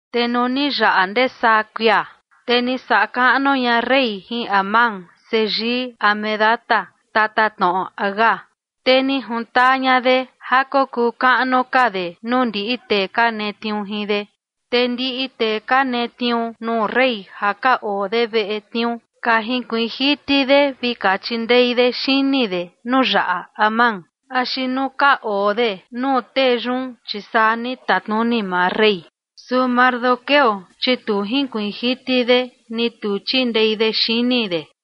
Te nuu ni yaꞌa ndee saa kuia, te ni saꞌa kaꞌnu ña rey jin Amán seyii Hamedata, tatatnoꞌo Agag, te ni jintaa ña de ja kokuu kaꞌnu ka de nuu ndiꞌi tee ka netniuu jin de. Te ndiꞌi tee ka netniuu nuu rey ja ka oo de veꞌe tniuu, ka jinkuiin jiti de vi ka chindei de xini de nuu yaꞌa Amán axi nuu ka oo de nuu tee yun, chi saa ni tatnuni maa rey. Su Mardoqueo, chi tu jinkuiin jiti de ni tu chindei de xini de.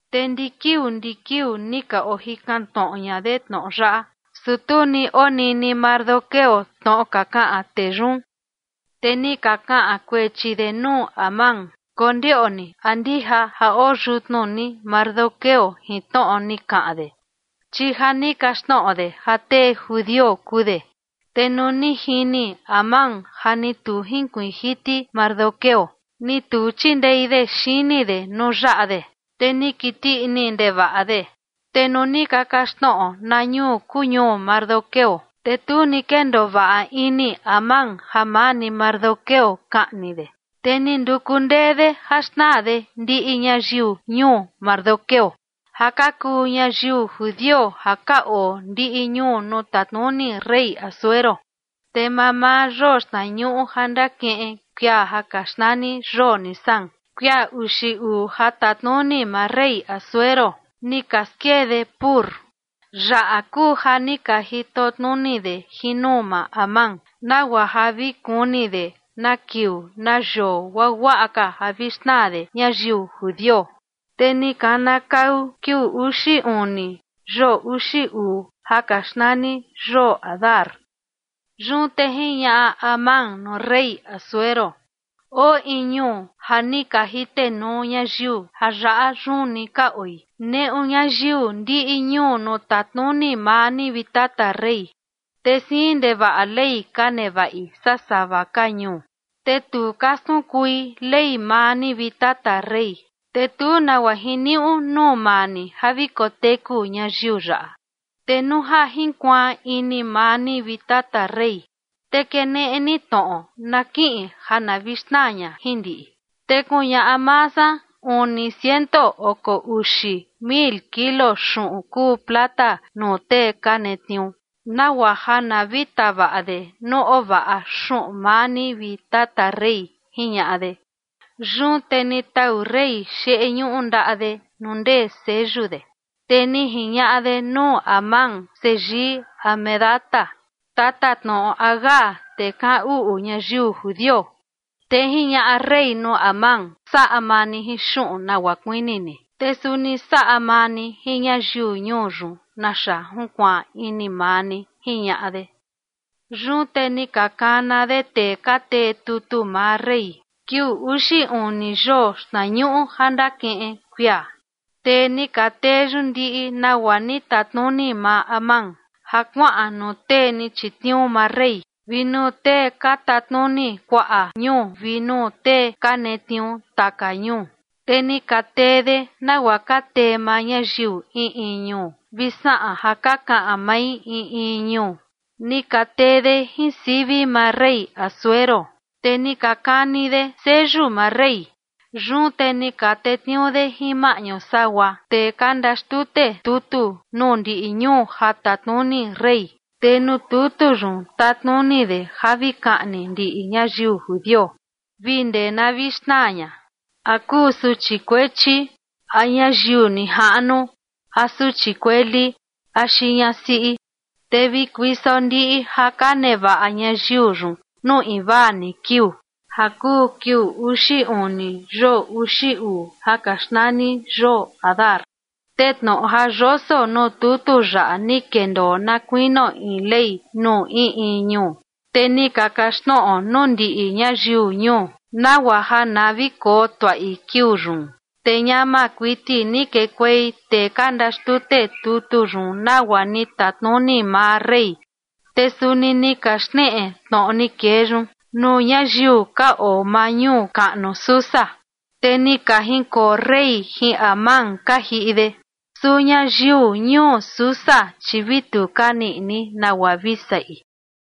Te ndi kiuu ndi kiuu ni ka ojikan tnoꞌo ña de tnoꞌo yaꞌa, su tu ni onini Mardoqueo tnoꞌo ka kaꞌan tee yun. Te ni ka kaꞌan kuechi de nuu Amán, kondioꞌni a ndija ja oo yutnu ni Mardoqueo jin tnoꞌo ni kaꞌan de, chi ja ni kaxtnoꞌo de ja tee judio kuu de. Te nuu ni jini Amán ja ni tu jinkuiin jiti Mardoqueo, ni tu chindei de xini de nuu yaꞌa de, te ni kiti ini ndevaꞌa de. Te nuu ni ka kaxtnoꞌo na ñuu kuu ñuu Mardoqueo, te tu ni kendoo vaꞌa ini Amán ja maa ni Mardoqueo kaꞌni de, te ni nduku ndee de ja xnaa de ndiꞌi ñayiu ñuu Mardoqueo ja ka kuu ñayiu judio ja ka oo ndiꞌi ñuu nuu tatnuni rey Asuero. Te mamaa yoo xtnañuꞌu ja ndakiꞌin kuia ja ka xnani yoo Nisán, kuia uxi uu ja tatnuni maa rey Asuero, ni ka skee de “pur”. Yaꞌa kuu ja ni ka jitotnuni de jin nuu maa Amán nagua ja vi kuni de na kiuu na yoo guaguaꞌa ka ja vi xnaa de ñayiu judio. Te ni kanakau kiuu uxi uni yoo uxi uu ja ka xnani yoo Adar. Yun te jiñaꞌa Amán nuu rey Asuero: ―Oo in ñuu ja ni ka jitenuu ñayiu ja yaꞌa yun ni ka oi, neꞌu ñayiu ndiꞌi ñuu nuu tatnuni maa ni, vi tata rey. Te siin ndevaꞌa ley ka nevaꞌi saa sava ka ñuu, te tu ka skunkui ley maa ni, vi tata rey, te tu nagua jiniuꞌu nuu maa ni ja vi koteku ñayiu yaꞌa. Te nuu ja jinkuaan ini maa ni, vi tata rey, te keneꞌe ni tnoꞌo na kiꞌin ja na vi xnaa ña jin ndiꞌi, te kuñaꞌa maa san uni ciento oko uxi mil kilo xuꞌun kuu plata nuu tee ka netniuu, nagua ja na vi tavaꞌa de nuu ovaꞌa xuꞌun maa ni, vi tata rey ―jiñaꞌa de. Yun te ni tau rey xeꞌe ñuꞌu ndaꞌa de nuu ndee seyu de, te ni jiñaꞌa de nuu Amán, seyii Hamedata, tatatnoꞌo Agag, tee kaꞌan uꞌu ñayiu judio. Te jiñaꞌa rey nuu Amán: ―Saꞌa maa ni jin xuꞌun nagua kuini ni, te suni saꞌa maa ni jin ñayiu ñuu yun naxa junkuaan ini maa ni ―jiñaꞌa de. Yun te ni ka kana de tee ka tee tutu maa rey kiuu uxi uni yoo xtnañuꞌu ja ndakiꞌin kuia, te ni ka tee yun ndiꞌi nagua ni tatnuni maa Amán, ja kuaꞌan nuu tee ni chitniuu maa rey vi nuu tee ka tatnuni kuaꞌa ñuu vi nuu tee ka netniuu taka ñuu. Te ni ka tee de nagua ka tee maa ñayiu in in ñuu vi saꞌan ja ka kaꞌan mai in in ñuu. Ni ka tee de jin sivi maa rey Asuero, te ni ka kani de seyu maa rey. Yun te ni ka tetniuu de jin maꞌñu sagua tee ka ndaxtute tutu nuu ndiꞌi ñuu ja tatnuni rey, te nuu tutu yun tatnuni de ja vi kaꞌni ndiꞌi ñayiu judio vi ndee na vi xnaa ña, a kuu suchi kuechi a ñayiu nijaꞌnu a suchi kueli axi ñasiꞌi, te vi kuiso ndiꞌi ja ka nevaꞌa ñayiu yun nuu invaa ni kiuu, ja kuu kiuu uxi uni yoo uxi uu ja ka xnani yoo Adar. Te tnoꞌo ja yoso nuu tutu yaꞌa ni kendoo na kuinio in ley nuu in in ñuu, te ni ka kaxtnoꞌo nuu ndiꞌi ñayiu ñuu, nagua ja na vi koo tuaꞌi kiuu yun. Te ñama kuiti ni kekuei tee ka ndaxtute tutu yun nagua ni tatnuni maa rey. Te suni ni ka xneꞌe tnoꞌo ni kee yun nuu ñayiu ka oo maa ñuu kaꞌnu Susa. Te ni ka jinkoo rey jin Amán ka jiꞌi de, su ñayiu ñuu Susa, chi vi tu ka niꞌi ini nagua vi saꞌi.